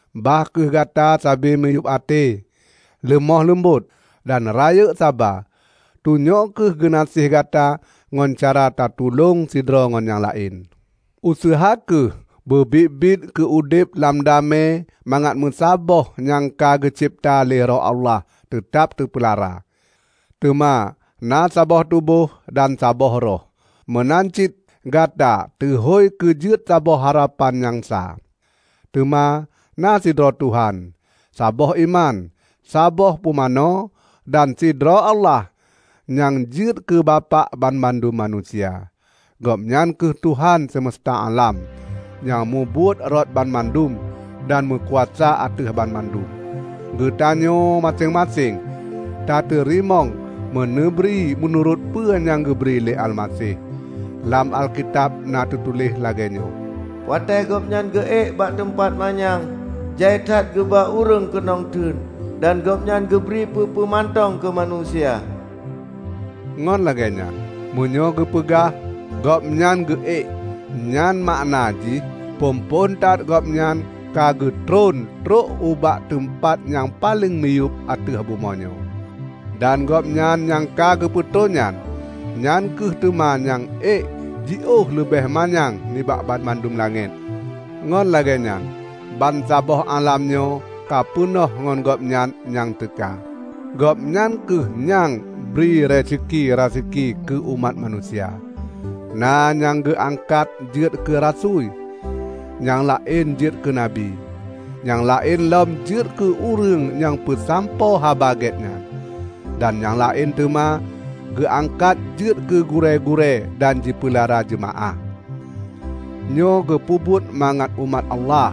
Bah kheueh gata sabe miyueb até, leumoh leumbot dan rayeuk saba. Tunyok kheueh geunaséh gata ngon cara tatulong sidroe ngon nyang laén. Useuha kheueh beu biet-biet keu udeb lam damé mangat meusaboh nyang ka geucebta lé Roh Allah teutab teupeulara. Teuma na saboh tuboh dan saboh Roh. Meunan cit gata teuhôi keu jeuet saboh harapan nyang sa. Teuma na sidroe Tuhan, saboh iman, saboh pumanö, dan sidroe Allah nyang jeuet keu Bapak banmandum manusia. Gobnyan kheueh Tuhan seumesta álam, nyang mubuet rot banmandum, dan meukuasa ateueh banmandum. Geutanyoe maséng-maséng tateurimong meuneubri meunurot peue nyang geubri lé Almaseh. Lam Alkitab na teutuléh lagée nyoe, "Watée Gobnyan geuék bak teumpat nyang manyang, jai that geuba ureuëng keunong teun; dan Gobnyan geubri peue-peue mantong keumanusia." Ngon lagée nyan, meunyoe geupeugah "Gobnyan geu ék" nyan makna jih phon-phon that Gobnyan ka geutreun trok ubak teumpat nyang paleng miyueb ateueh bumoe nyoe. Dan Gobnyan nyang ka geutreun nyan, nyan kheueh teuma nyang ék jiôh leubeh manyang nibak banmandum langét, ngon lagée nyan bansaboh álam nyoe ka peunoh ngon Gobnyan nyang teuka. Gobnyan kheueh nyang "bri raseki-raseki keu umat manusia"; na nyang geuangkat jeuet keu rasui, nyang laén jeuet keu nabi; nyang laén lom jeuet keu ureuëng nyang peusampoe Haba Gét nyan, dan nyang laén teuma geuangkat jeuet keu gurée-gurée dan jipeulara jeumaáh. Nyoe geupeubuet mangat umat Allah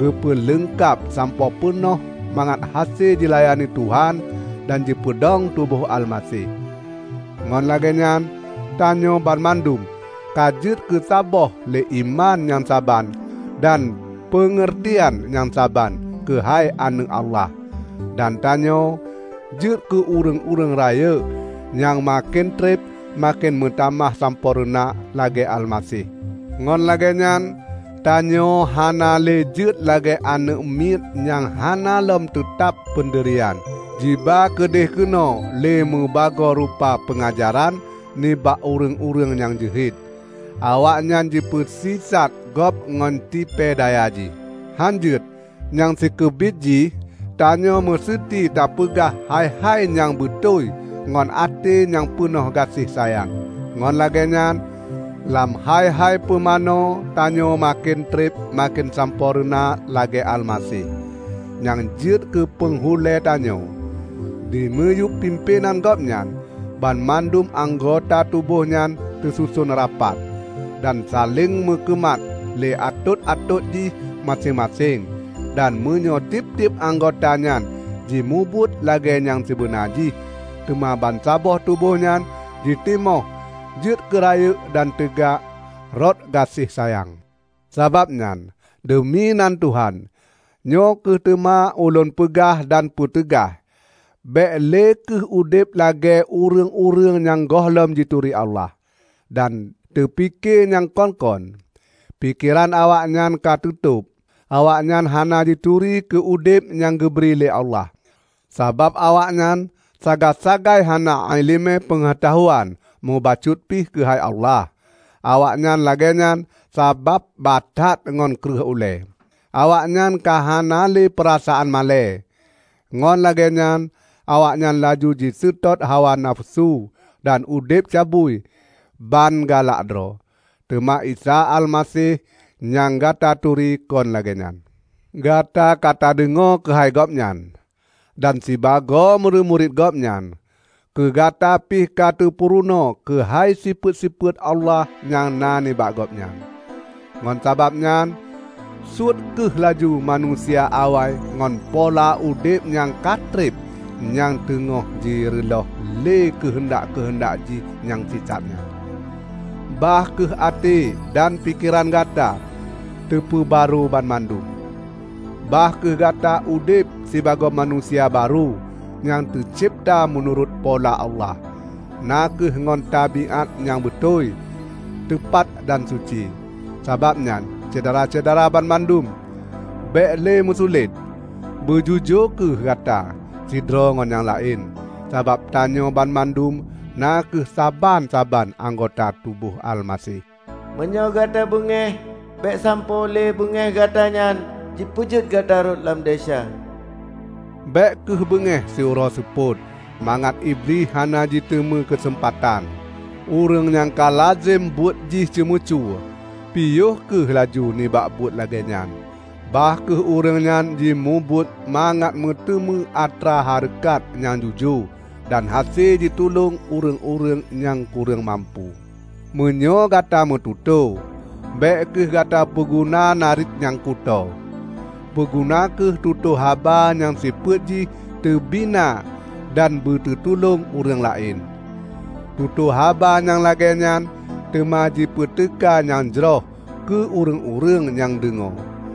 geupeu leungkab sampoe peunoh mangat hase jilayani Tuhan dan jipeudong tuboh Almaseh. Ngon lagée nyan tanyoe banmandum ka jeuet keusaboh lé iman nyang saban dan peungeurtian nyang saban keuhai Aneuëk Allah. Dan tanyoe jeuet keu ureuëng-ureuëng rayeuk nyang maken treb maken meutamah sampoereuna lagée Almaseh. Ngon lagée nyan tanyoe hana lé jeuet lagée aneuëk miet nyang hana lom teutab peundirian jiba keudeuh keunoe lé mubagoe rupa peungajaran nibak ureuëng-ureuëng nyang jeuhet. Awaknyan jipeusisat gob ngon tipée daya jih. Hán jeuet! Nyang sikeubiet jih tanyoe meuseuti tapeugah hai-hai nyang beutôi ngon até nyang peunoh gaséh sayang, ngon lagée nyan, lam hai-hai peumanoe tanyoe maken treb maken sampoereuna lagée Almaseh, nyang jeuet keu panghulée tanyoe. Dimiyueb pimpénan Gobnyan, banmandum anggota tuboh nyan teususon rapat, dan saléng meukeumat lé atot-atot jih maséng-maséng. Dan meunyoe tieb-tieb anggota nyan jimubuet lagée nyang sibeuna jih, teuma bansaboh tuboh nyan jitimoh jeuet keu rayeuk dan teuga rot gaséh sayang. Sabab nyan, deumi nan Tuhan, nyoe kheueh teuma ulôn peugah dan peuteugaih: bék lé kheueh udeb lagée ureuëng-ureuëng nyang gohlom jituri Allah, dan teupike nyang kon-kon. Pikeran awaknyan ka teutôb. Awaknyan hana jituri keu udeb nyang geubri lé Allah, sabab awaknyan sagai-sagai hana iéleumé peungeutahuan mubacut pih keuhai Allah. Awaknyan lagée nyan, sabab batat ngon kreueh ulée. Awaknyan ka hana lé peurasaan malée, ngon lagée nyan awaknyan laju jiseutôt hawa nafeusu, dan udeb cabui ban galak droe. Teuma Isa Almaseh nyang gata turi kon lagée nyan! Gata ka tadeungoe keuhai Gobnyan! Dan sibagoe murit-murit Gobnyan, keu gata pih ka teupurunoe keuhai sifeuet-sifeuet Allah nyang na nibak Gobnyan! Ngon sabab nyan suet kheueh laju manusia awai ngon pola udeb nyang ka treb nyang teungoh jireulôh lé keuheundak-keuheundak jih nyang sisat nyan. Bah kheueh até dan pikeran gata teupeubarô banmandum. Bah kheueh gata udeb sibagoe manusia barô nyang teucebta meunurot pola Allah; na kheueh ngon tabiát nyang beutôi, teupat dan suci. Sabab nyan Syedara-syedara banmandum, bék lé meusulet. Beujujoe kheueh gata sidroe ngon nyang laén, sabab tanyoe banmandum na kheueh saban-saban anggota tuboh Almaseh. Meunyoe gata beungéh, bék sampoe lé beungéh gata nyan jipeujeuet gata rhot lam desya. Bék kheueh beungéh siuroe seupôt, mangat Iblih hana jiteumé keuseumpatan. Ureuëng nyang kalazem buet jih ceumeucue piôh kheueh laju nibak buet lagée nyan. Bah kheueh ureuëng nyan jimubuet mangat meuteumé atra hareukat nyang jujoe dan hase jitulông ureuëng-ureuëng nyang kureueng mampu. Meunyoe gata meututoe, bék kheueh gata peuguna nariet nyang kutoe. Peuguna kheueh tutoe haba nyang sifeuet jih teubina dan beuteutulông ureuëng laén. Tutoe haba nyang lagée nyan teuma jipeuteuka nyang jroh keu ureuëng-ureuëng nyang deungoe.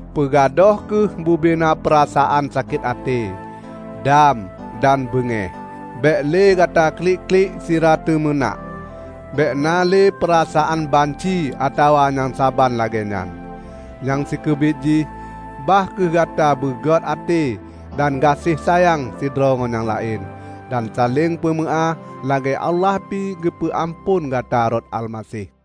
Peugadôh kheueh bubena peurasaan sakét até, dam dan beungéh. Bék lé gata klik-klik sira teumeunak. Bék na lé peurasaan banci atawa nyang saban lagée nyan. Nyang sikeubiet jih, bah kheueh gata beugét até dan gaséh sayang sidroe ngon nyang laén, dan saléng peumeuáh lagée Allah pi geupeu amphon gata rot Almaseh.